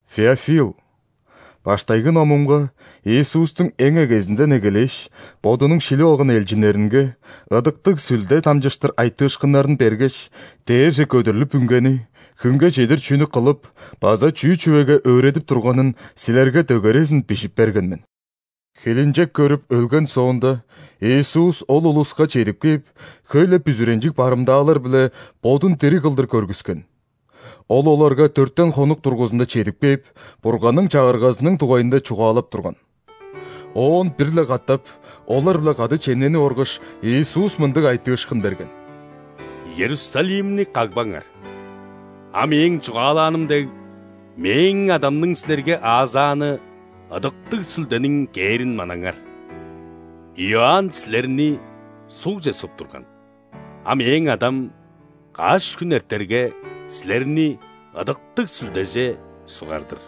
Феофил, баштайгы номумга Иисустуң эң эгезинден эгелээш, Бодунуң шилип алган элчиннеринге Ыдыктыг Сүлде дамчыштыр айтыышкыннарын бергеш, дээрже көдүрлүп үнгени хүнге чедир чүнү кылып база чүү чүвеге өөредип турганын силерге дөгерезин бижип берген мен. Хилинчек көрүп, өлген соонда, Иисус ол улуска чедип кээп, хөй-ле бүзүренчиг барымдаалар-биле Бодун дириг кылдыр көргүскен. Ол оларга дөртен хонук дургузунда чедип кээп, Бурганның Чагыргазының дугайында чугаалап турган. Оон бир-ле катап, олар-биле кады чемненип оргаш, Иисус мындыг айтыышкын берген: «Иерусалимни кагбаңар, а Мээң чугаалааным дег, Мээң Адамның силерге аазааны Ыдыктыг Сүлдениң кээрин манаңар. Иоанн силерни ·сугже суп турган, а Мээң Адам, каш хүн эртерге, силерни Ыдыктыг Сүлдеже сугар-дыр».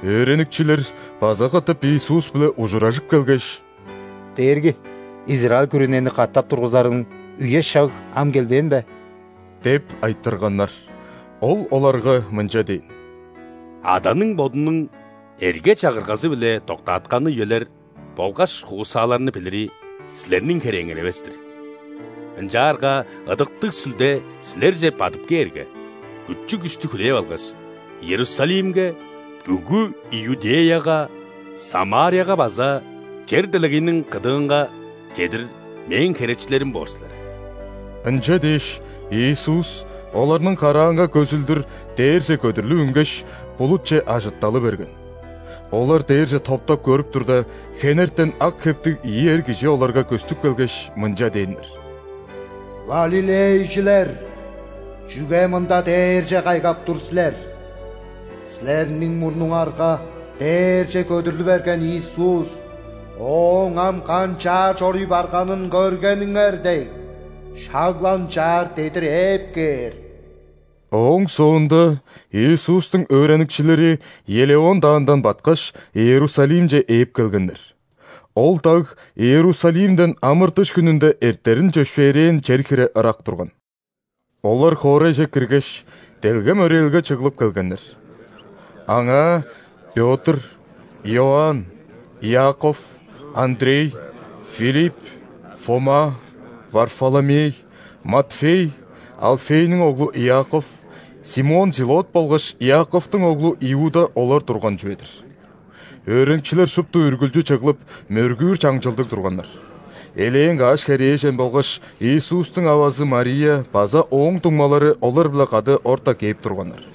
Өөреникчилер база катап Иисус-биле ужуражып келгеш: «Дээрги, израиль күрүнени катап тургузарың үе-шаг ам келбээн бе?» – деп айтырганнар. Ол оларга мынча дээн: «Аданың Бодунуң эрге-чагыргазы-биле доктаатканы үелер болгаш хуусааларны билири – силерниң херээңер эвес-тир! Ынчаарга Ыдыктыг Сүлде силерже бадып кээрге, күчү-күштү хүлээп алгаш, Иерусалимге, бүгү Иудеяга, Самарияга база чер-делегейниң кыдыынга чедир Мээң херечилерим боор силер». Ынча дээш, Иисус оларның караанга көзүлдүр дээрже көдүрлүп үнгеш, булутче ажытталы берген. Олар дээрже топтап көрүп турда, хенертен ак хептиг ийи эр кижи оларга көстүп келгеш, мынча дээннер: «Галилейжилер, чүге мында дээрже кайгап тур силер? Силерниң мурнуңарга дээрже көдүрлү берген Иисус, Ооң ам канчаар чоруй барганын көргениңер дег, шак-ла ынчаар дедир ээп кээр». Ооң соонда Иисустуң өөреникчилери Елеон даандан баткаш, Иерусалимче ээп келгеннер. Ол даг Иерусалимден ·амыр-дыш хүнүнде эртерин чөпшээрээн чер хире ырак турган. Олар хоорайже киргеш, делгем өрээлге чыглып келгеннер. Аңаа Пётр, Иоанн, Иаков, Андрей, Филипп, Фома, Варфоломей, Матфей, Алфейниң оглу Иаков, Симон Зилот болгаш Иаковтуң оглу Иуда олар турган чүве-дир. Өөреникчилер шупту үргүлчү чыглып, мөргүүр чаңчылдыг турганнар. Элээн каш херээжен болгаш Иисустуң авазы Мария база Ооң дуңмалары олар-биле кады орта кээп турганнар.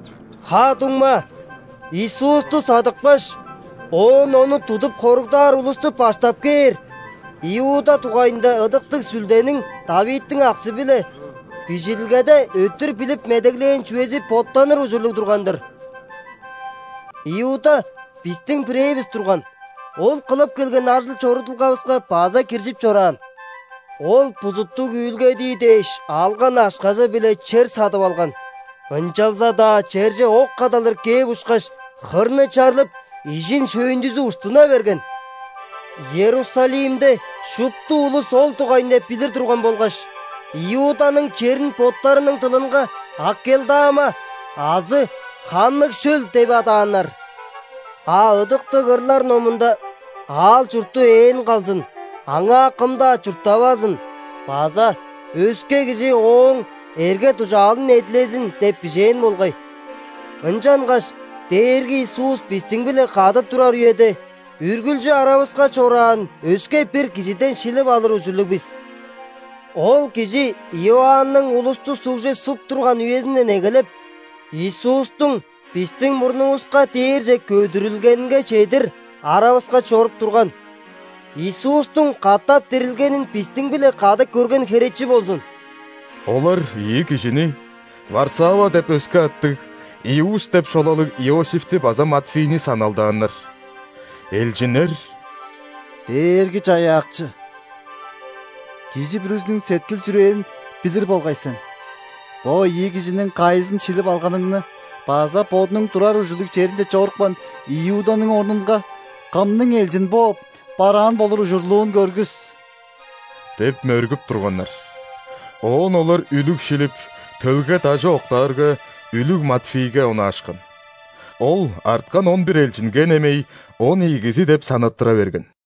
«Ха-дуңма, Иисусту садыпкаш, оон Ону тудуп хоругдаар улусту баштап кээр Иуда дугайында Ыдыктыг Сүлдениң ·Давидтиң аксы-биле Бижилгеде өттүр билип медеглээн чүвези боттаныр ужурлуг турган-дыр. Иуда бистиң бирээвис турган, ол кылып келген ажыл-чорудулгавыска база киржип чораан». (Ол бузуттуг үүлгедии дээш алган акшазы-биле чер садып алган, ынчалза-даа черже ок кадалдыр кээп ушкаш, хырны чарлып, ижин-шөйүндүзү уштуна берген. Иерусалимде шупту улус ол дугайында билир турган болгаш, Иуданың черин боттарының дылынга Акелдама азы «Ханныг шөл» деп адааннар.) «А Ыдыктыг ырлар номунда: „Аал-чурту ээн калзын, аңаа кым-даа чурттавазын“ база „Өске кижи ооң эрге-дужаалын эдилезин“ – деп бижээн болгай. Ынчангаш Дээрги Иисус бистиң-биле кады турар үеде, үргүлчү аравыска чораан өске-бир кижиден шилип алыр ужурлуг бис. Ол кижи Иоанның улусту ·сугже суп турган үезинден эгелеп, Иисустуң бистиң мурнувуска дээрже көдүрүлгенинге чедир аравыска чоруп турган, Иисустуң катап дирилгенин бистиң-биле кады көрген херечи болзун». Олар ийи кижини: Варсава деп өске аттыг, Иуст деп шолалыг Иосифти база Матфийни саналдааннар. Элчиннер: «Дээрги-Чаяакчы, кижи бүрүзүнүң сеткил-чүрээн билир болгай сен. Бо ийи кижиниң кайызын шилип алганыңны база бодунуң турар ужурлуг черинче чорупкан Иуданың орнунга кымның элчин бооп, бараан болур ужурлуун көргүс» – деп мөргүп турганнар. Оон олар үлүг шилип, төлге дажы октаарга, үлүг Матфийге онаашкан. Ол арткан он бир элчинге немей он ийигизи деп санаттыра берген.